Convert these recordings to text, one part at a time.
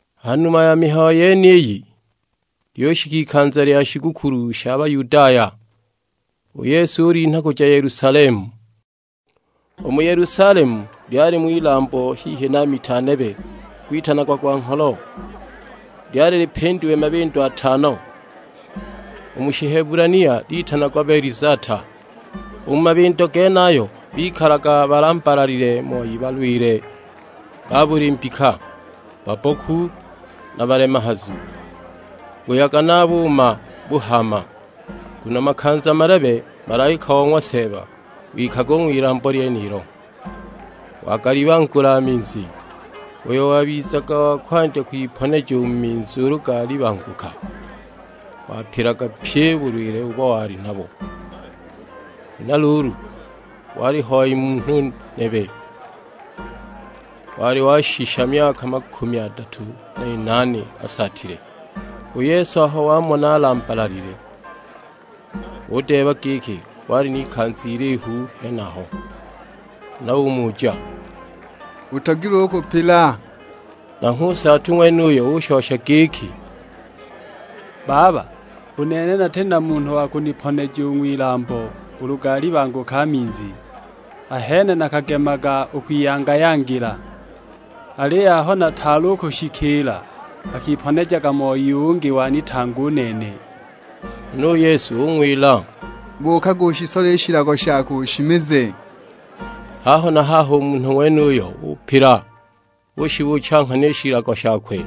Ha numa ya mihayo yeniyi, lyushika ikanza lya shigukulu sha Bayudaya, u Yesu ulinha kuja Yelusalemu. U mu Yelusalemu lyalimo ilambo hihi na mita nebe gwitanagwa gwa ngholo, lyali lipindiwe mabindo atano, u mu Shihebulania litanagwa Betizata. U mu mabindo genayo bikalaga balambalalile moi balwile ba buli mbika: babboku na balemehazu, [buyaga na a buuma buhaama. Nguno makanza malebe malaika o ng'wa Seeba wikaga u ng'wilambo lyenilo, wagalibangula a minzi. Uyo wabizaga wa kwandya kwiponeja u mu minzi ulu galibanguka, wapilaga pyi u bulwile ubo wali nabo.] Huna luulu, waliho hoi munhu nebe wali washisha myaka makumi adatu n'inaane asaatile. U Yesu aho wamona alambalalile udeeba giki wali n'ikanza ilihu ali henaho. Huna umuja, "Utogilwe u kupila?" Nanghwe u nsaatu ng'wenuyo ushosha giki, "Baba, u nene nati na munhu wa kuniponeja u ng'wilambo ulu galibanguka a minzi; ahene nakagemaga u kwiyanga-yangila, aliyo aho nataali u kushikiila, akiponejaga moi ungi wanitanga u nene!" Huna u Yesu ung'wila, "Buukaga ushisole i shilago shako, ushimize." Haho na haho u munhu ng'wenuyo upila, ushibuucha nghana i shilago shakwe,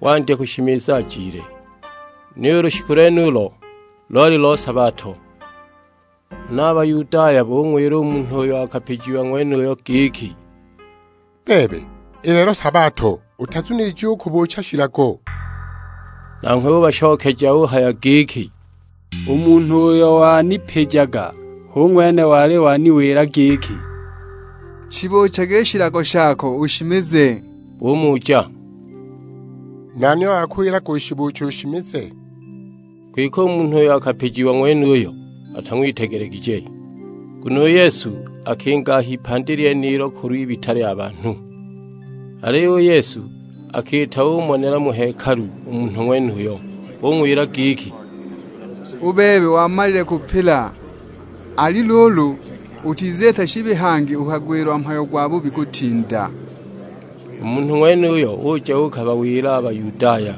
wandya kushimiza ajile! Niyo u lushiku lwenulo loli lo sabato. Huna a Bayudaya bung'wila u munhu uyo akapijiwa ng'wenuyo giki, "Bebe, i lelo sabato, utazunilijiwe u kubuucha shilago!" Nanghwe ubashokeja uhaya giki, "U munhu uyo wanipijaga hu ng'wene wali waniwila giki, 'Shibuuchage i shilago shako ushimize.' " Bumuja, "Nani uyo wakuwilaga ushibuuche ushimize?" Kwike u munhu uyo akapijiwa ng'wenuyo, atang'witegelegije; nguno u Yesu akinga a h'ipandi lyenilo kulw'ibita lya banhu. Aliyo u Yesu akiita umonela mu hekalu u munhu ng'wenuyo; ung'wila giki, "U bebe wamalile kupila, ali luulu, utiziita shibi hangi ukagwilwa mhayo gwabubi kutinda!" U munhu ng'wenuyo uja uukabawila a Bayudaya,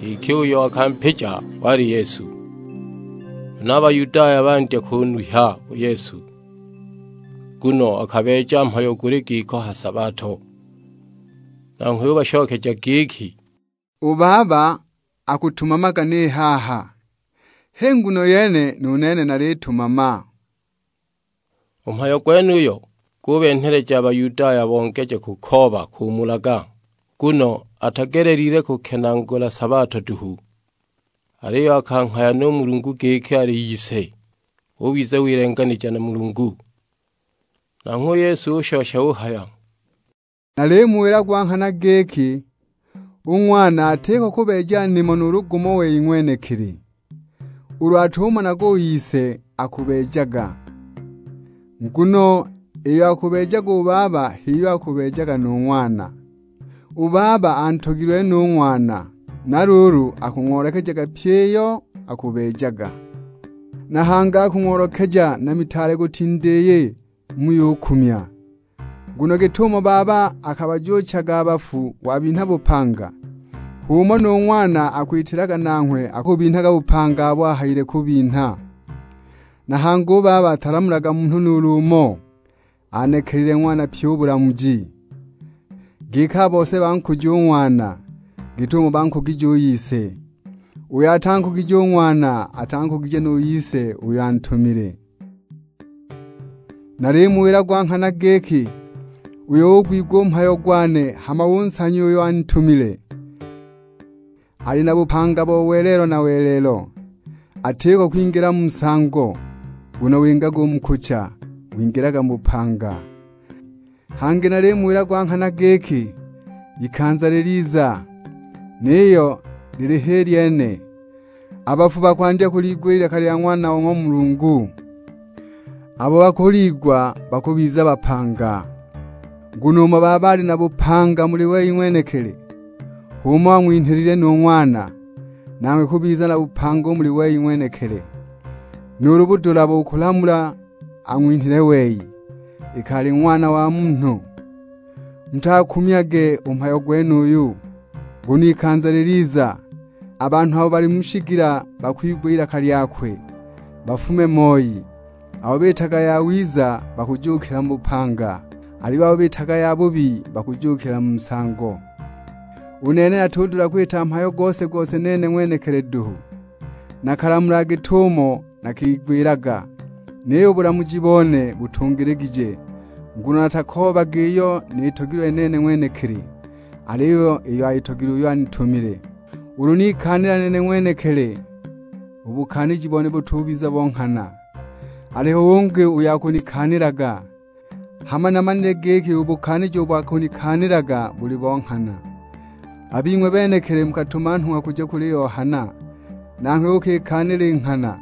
giki uyo akampija wali Yesu. Huna a Bayudaya bandya kunuhya u Yesu, nguno akabeeja mhayo guli giko ha sabato. Nanghwe ubashokeja giki, "U Baba akutumamaga ni haha, h'i nguno yene nu nene nalitumama." U mhayo gwenuyo gubenheleja a Bayudaya bongeje kukooba kumulaga; nguno atagelelile kukenaagula sabato duhu, aliyo akanghaya nu Mulungu giki ali Ise. Ubiza wilenganija na Mulungu! Nanghwe u Yesu ushosha uhaya, "Nalimuwila gwa nghana giki, u Ng'wana atiko kubeeja nimo nuulu gumo wei ng'wenekili, ulu atumonaga u Ise akubeejaga; nguno iyo akubeejaga u Baba h'iyo akubeejaga nu Ng'wana. U Baba antogilwe no u Ng'wana, na luulu akung'oolekejaga pyi iyo akubeejaga, na hangi akung'oolekeja na mitaale kutinda iyi, muyukumya. Nguno git'umo Baba akabajuuchaga a bafu wabinha bupanga, h'umo nu Ng'wana akwitilaga; nanghwe akubinhaga bupanga abo ahayile kubinha. Na hangi u Baba atalamulaga munhu nuulu umo; anekelile Ng'wana pyi u bulamuji, giki a bose bankuje u Ng'wana, git'umo bankugigije u Ise. Uyo atankugije u Ng'wana atankugije nu Ise, uyo antumile. Nalimuwila gwa nghana giki, uyo ugwigwa u mhayo gwane hama unsanya uyo anitumile, ali na bupanga bo welelo na welelo. Atiko kwingila mu nsango, nguno wingaga u mu kucha, wingilaga mu bupanga. Hangi nalimuwila gwa nghana giki, ikanza liliza; niyo ili h'i lyene. A bafu bakwandya kuliigwa i lilaka lya Ng'wana o ng'wa Mulungu, abo bakuliigwa bakubiza bapanga. Nguno umo Baba ali na bupanga muli wei ng'wenekili, h'umo ang'winhilile nu Ng'wana, nanghwe kubiza na bupanga u muli wei ng'wenekili. Nu budula bo kulamula ang'winhile wei, iki ali Ng'wana wa Munhu. Mutagukumyage u mhayo gwenuyu, nguno ikanza liliza; a banhu abo bali mu shigila bakwigwa ilaka lyakwe bafume moi. Abo biitaga yawiza, bakujuukila mu bupanga, aliyo abo biitaga yabubi, bakujuukila mu nsango." "U nene natudula kwita mhayo gose-gose nene ng'wenekili duhu. Nakalamulaga git'umo nakigwilaga, niyo u bulamuji bone butungiligije. Nguno natakoobaga iyo nitogilwe nene ng'wenekili, aliyo iyo ayitogilwe uyo anitumile. Ulu nikaanila nene ng'wenekili, u bukaaniji bone butubiza bo nghana. Aliho ungi uyo akunikaanilaga, hama namanile giki u bukaaniji ubo akunikaanilaga buli bo nghana. A bing'we benekili mukatuma nhung'wa kuja kuli Yohana, nanghwe ukikaanila i nghana.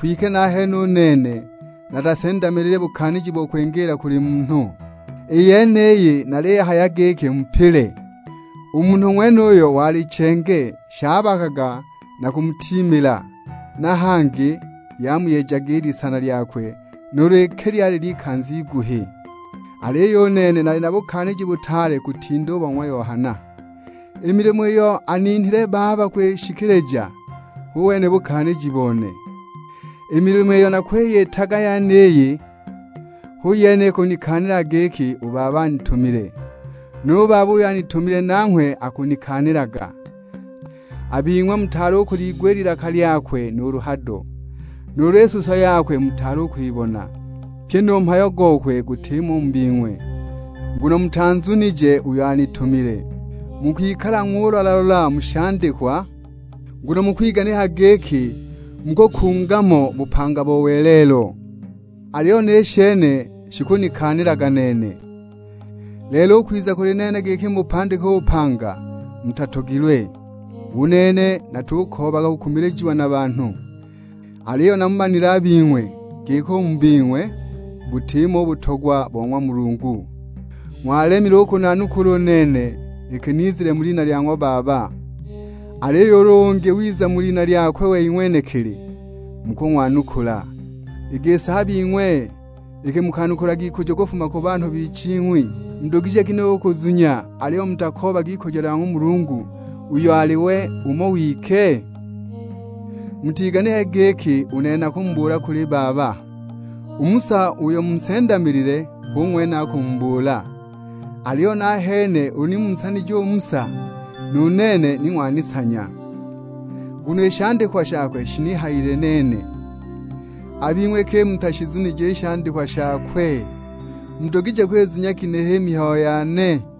Kwike nahene u nene natasendamilile bukaaniji bo kwingiila kuli munhu; i yeniyi naliyihaya giki mupile. U munhu ng'wenuyo wali chenge, shabakaga na kumutiimila; na hangi lyamuyejaga i lisana lyakwe nuulu iki lyali ly'ikanza iguhi. Aliyo u nene nali na bukaaniji butaale kutinda u bo ng'wa Yohana. I milimo iyo aninhile Baba kwishikilija, hu wene u bukaaniji bone. I milimo iyo nakwiyitaga yeniyi, hu yene ikunikaanilaga giki u Baba anitumile. Nu Baba uyo anitumile nanghwe akunikaanilaga. A bing'we mutaali u kuliigwa i lilaka lyakwe nuulu hado, nuulu i suso yakwe mutaali u kwibona. Pyi nu mhayo gokwe gutimo u mu bing'we, nguno mutanzunije uyo antumile. Mukwikalaga ng'ulola-lola mu shandikwa, nguno mukwiganikaga giki mukukunga mo bupanga bo welelo, aliyo ni shene shikunikaanilaga nene! Lelo u kwiza u kuli nene giki mubupandike u bupanga, mutatogilwe! U nene natukoobaga kukumilijiwa na banhu. Aliyo namumanile a bing'we; giki u mu bing'we butimo u butogwa bo ng'wa Mulungu. Ng'walemile u kunanukula u nene iki nizile mu lina lya ng'wa Baba; aliyo ulu ungi wiza mu lina lyakwe wei ng'wenekili, mukung'wanukula. I gisi a bing'we iki mukanukulaga ikujo kufuma ku banhu biching'wi, mudugije ginehe u kuzunya aliyo mutakoobaga ikujo lya ng'wa Mulungu uyo ali we umo wike? Mutiganikage giki u nene nakumubuula kuli Baba, u Musa uyo munsendamilile hu ng'wene akumubuula. Aliyo nahene ulu ni munsanije u Musa, nu nene ni ng'wanisanya, nguno i shandikwa shakwe shinihayile nene. A bing'we iki mutashizunije i shandikwa shakwe, mudugije kwizunya ginehe i mihayo yane?"